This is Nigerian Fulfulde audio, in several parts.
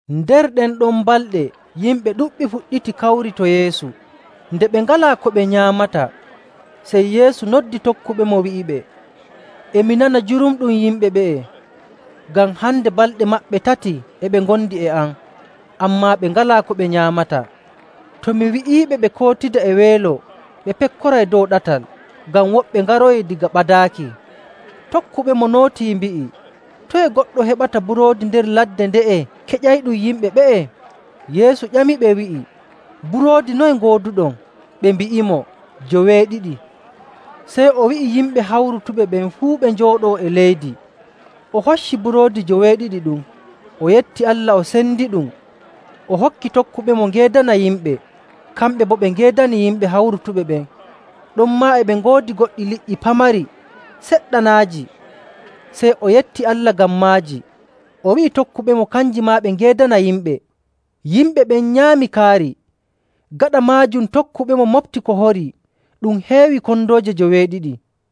Nder ɗen ɗon balɗe yimɓe ɗuɗɓe fuɗɗiti kawri to Yeesu. Nde ɓe ngalaa ko ɓe nyaamata, sey Yeesu noddi tokkuɓemo, wi'iɓe, “E mi nana jurumɗum yimɓe ɓe'e ngam hande balɗe maɓɓe tati e ɓe ngondi e am, ammaa ɓe ngalaa ko ɓe nyaamata. To mi wi'iiɓe ɓe kootida e weelo, ɓe pekkoray dow ɗatal, ngam woɓɓe ngaroyii daga ɓadaaki.” Tokkuɓemo nootii mbi'i, “Toye goɗɗo heɓata buroodi nder ladde nde'e keƴayɗum yimɓe ɓe'e?” Yeesu ƴamiɓe wi'i, “Buroodi noye ngooduɗon?” Ɓe mbi'imo, “Joweeɗiɗi.” Sey o wi'i yimɓe hawrutuɓe ɓen fuu ɓe njooɗoo e leydi. O hocci buroodi joweeɗiɗi ɗum, o yetti Allah, o sendiɗum, o hokki tokkuɓemo ngeedana yimɓe, kamɓe boo ɓe ngeedani yimɓe hawrutuɓe ɓen. Ɗonmaa e ɓe ngoodi goɗɗi liƴƴi pamari seɗɗanaaji, sey o yetti Allah ngam maaji, o wi'i tokkuɓemo kanji maa ɓe ngeedana yimɓe. Yimɓe ɓen nyaami kaari. Gaɗa maajum tokkuɓemo moɓti ko horii, ɗum heewi kondooje joweeɗiɗi.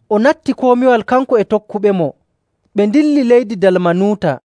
o natti komiwal, kanko e tokkuɓemo, ɓe ndilli leydi Dalmanuuta.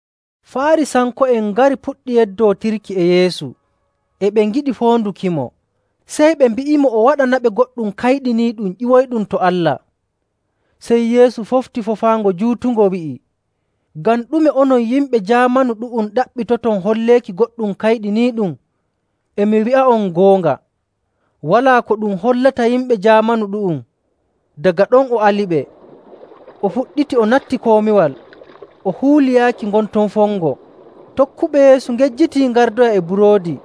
Faarisanko'en ngari puɗɗi yeddootirki e Yeesu. E ɓe ngiɗi foondukimo, sey ɓe mbi'imo o waɗanaɓe goɗɗum kayɗiniiɗum ƴiwoyɗum to Allah.. Sey Yeesu fofti foofaango juutungo wi'i, “Ngam ɗume onon yimɓe jaamanu ɗu'um ɗaɓɓitoton holleeki goɗɗum kayɗiniiɗum? E mi wi'a'on goonga, walaa ko ɗum hollata yimɓe jaamanu ɗu'um.”. Daga ɗon o aliɓe, o fuɗɗiti o natti komiwal, o huuli yaaki ngon ton fongo. Tokkuɓe Yeesu ngejjitii ngardoya e buroodi,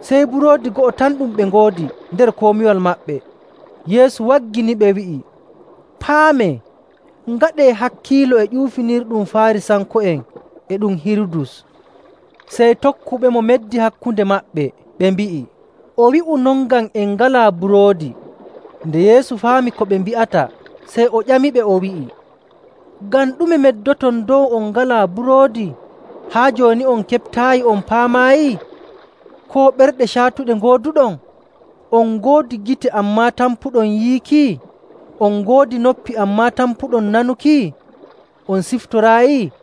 sey buroodi go'o tan ɗum ɓe ngoodi nder komiwal maɓɓe. Yeesu wagginiɓe wi'i, “Paamee, ngaɗee hakkiilo e ƴuufinirɗum Faarisanko'en e ɗum Hirudus.”. Sey tokkuɓemo meddi hakkunde maɓɓe, ɓe mbi'i, “O wi'u non ngam en ngalaa buroodi.” Nde Yeesu faami ko ɓe mbi'ata, sey o ƴamiɓe, o wi'i, “Ngam ɗume meddoton dow on ngalaa buroodi? Haa jooni on keɓtaayi on paamaayi? Koo ɓerɗe caatuɗe ngooduɗon? On ngoodi gite, ammaa tampuɗon yiiki? On ngoodi noppi, ammaa tampuɗon nanuki? On ciftoraayi?.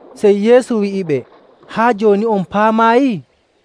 Sey Yeesu wi'iɓe, “Haa jooni on paamaayi?”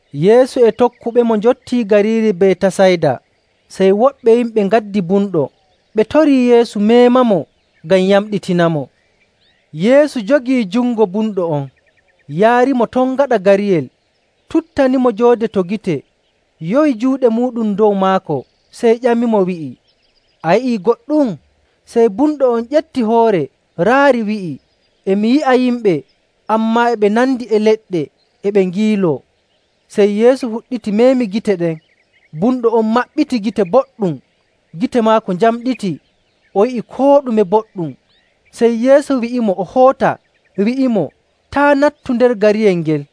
Yeesu e tokkuɓemo njottii gariiri Betasayda, sey woɓɓe yimɓe ngaddi bumɗo, ɓe torii Yeesu meemamo ngam yamɗitinamo. Yeesu jogii jungo bumɗo on, yaarimo ton gaɗa gariyel, tuttanimo joode to gite yowi juuɗe muuɗum dow maako, sey ƴamimo, wi'i, “A yi'ii goɗɗum?” Sey bumɗo on ƴefti hoore, raari, wi'i, “E mi yi'a yimɓe, ammaa e ɓe nandi e leɗɗe e ɓe ngiiloo.” Sey Yeesu fuɗɗiti meemi gite ɗen. Bumɗo on maɓɓiti gite boɗɗum, gite maako njamɗiti, o yi'i koo ɗume boɗɗum. Sey Yeesu wi'imo o hoota, wi'imo, “Taa' nattu nder gariyel ngel.”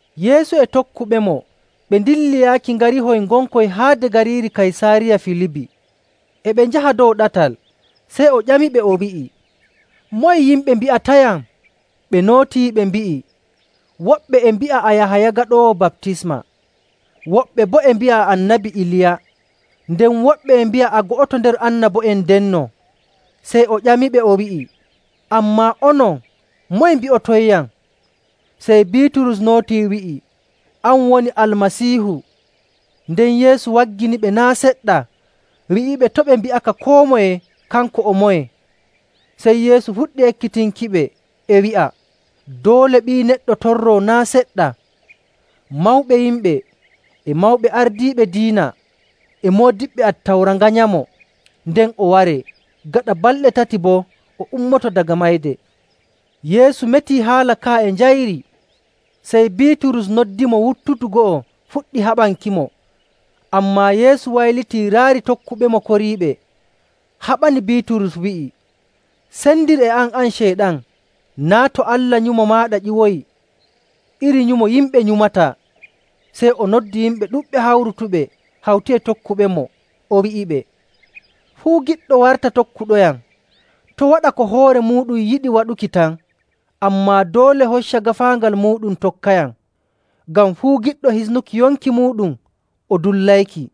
Yeesu e tokkuɓemo ɓe ndilli yaaki ngarihoy ngonkoy haade gariiri Kaysaariya Filibi. E ɓe njaha dow ɗatal sey o ƴamiɓe, o wi'i, “Moye yimɓe mbi'atayam?” Ɓe nootii ɓe mbi'i, “Woɓɓe e mbi'a a Yahaya Gaɗoowo Baptisma. Woɓɓe boo e mbi'a a Annabi Iliya. Nden woɓɓe e mbi'a a go'oto nder annabo'en ndenno.”. Sey o ƴamiɓe, o wi'i, “Ammaa onon, moye mbi'otonyam?” Sey Biiturus nootii wi'i, “An woni Almasiihu.”. Nden Yeesu wagginiɓe naa' seɗɗa wi'iɓe to' ɓe mbi'aka koo moye kanko o moye. Sey Yeesu fuɗɗi ekkitinkiɓe e wi'a doole Ɓii Neɗɗo torroo naa' seɗɗa. Mawɓe yimɓe, e mawɓe ardiiɓe diina, e moodiɓɓe Attawra nganyamo, nden o waree. Gaɗa balɗe tati boo o ummoto daga mayde. Yeesu metii haala ka'a e njayri. Sey Biiturus noddimo wuttudu go'o fuɗɗi haɓankimo. Ammaa Yeesu waylitii raari tokkuɓemo koriiɓe, haɓani Biiturus, wi'i, “Sendir e am, an Ceyɗan! Naa' to Allah nyumo maaɗa ƴiwoyi, iri nyumo yimɓe nyumataa.” Sey o noddi yimɓe ɗuɗɓe hawrutuɓe hawti e tokkuɓemo, o wi'iɓe, “Fuu giɗɗo warta tokkuɗoyam, to' waɗa ko hoore muuɗum yiɗi waɗuki tan, ammaa doole hocca gaafaangal muuɗum tokkayam.. Ngam fuu giɗɗo hisnuki yonki muuɗum o dullayki.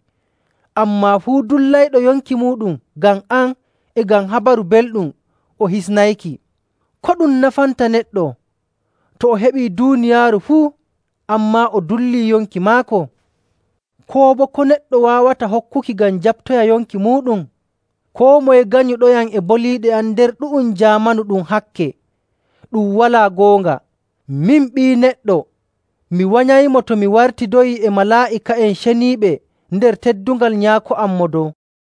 Ammaa fuu dullayɗo yonki muuɗum ngam am e ngam Habaru Belɗum o hisnayki.. Ko ɗum nafanta neɗɗo, to o heɓii duuniyaaru fuu, ammaa o dullii yonki maako? Koo boo ko neɗɗo waawata hokkuki ngam jaɓtoya yonki muuɗum? Koo moye ganyuɗoyam e boliiɗe am nder ɗu'um jaamanu ɗum hakke, ɗum walaa goonga, min Ɓii Neɗɗo mi wanyaymo to mi wartidoyii e malaa'ika'en ceniiɓe nder teddungal Nyaako am Mo Dow.”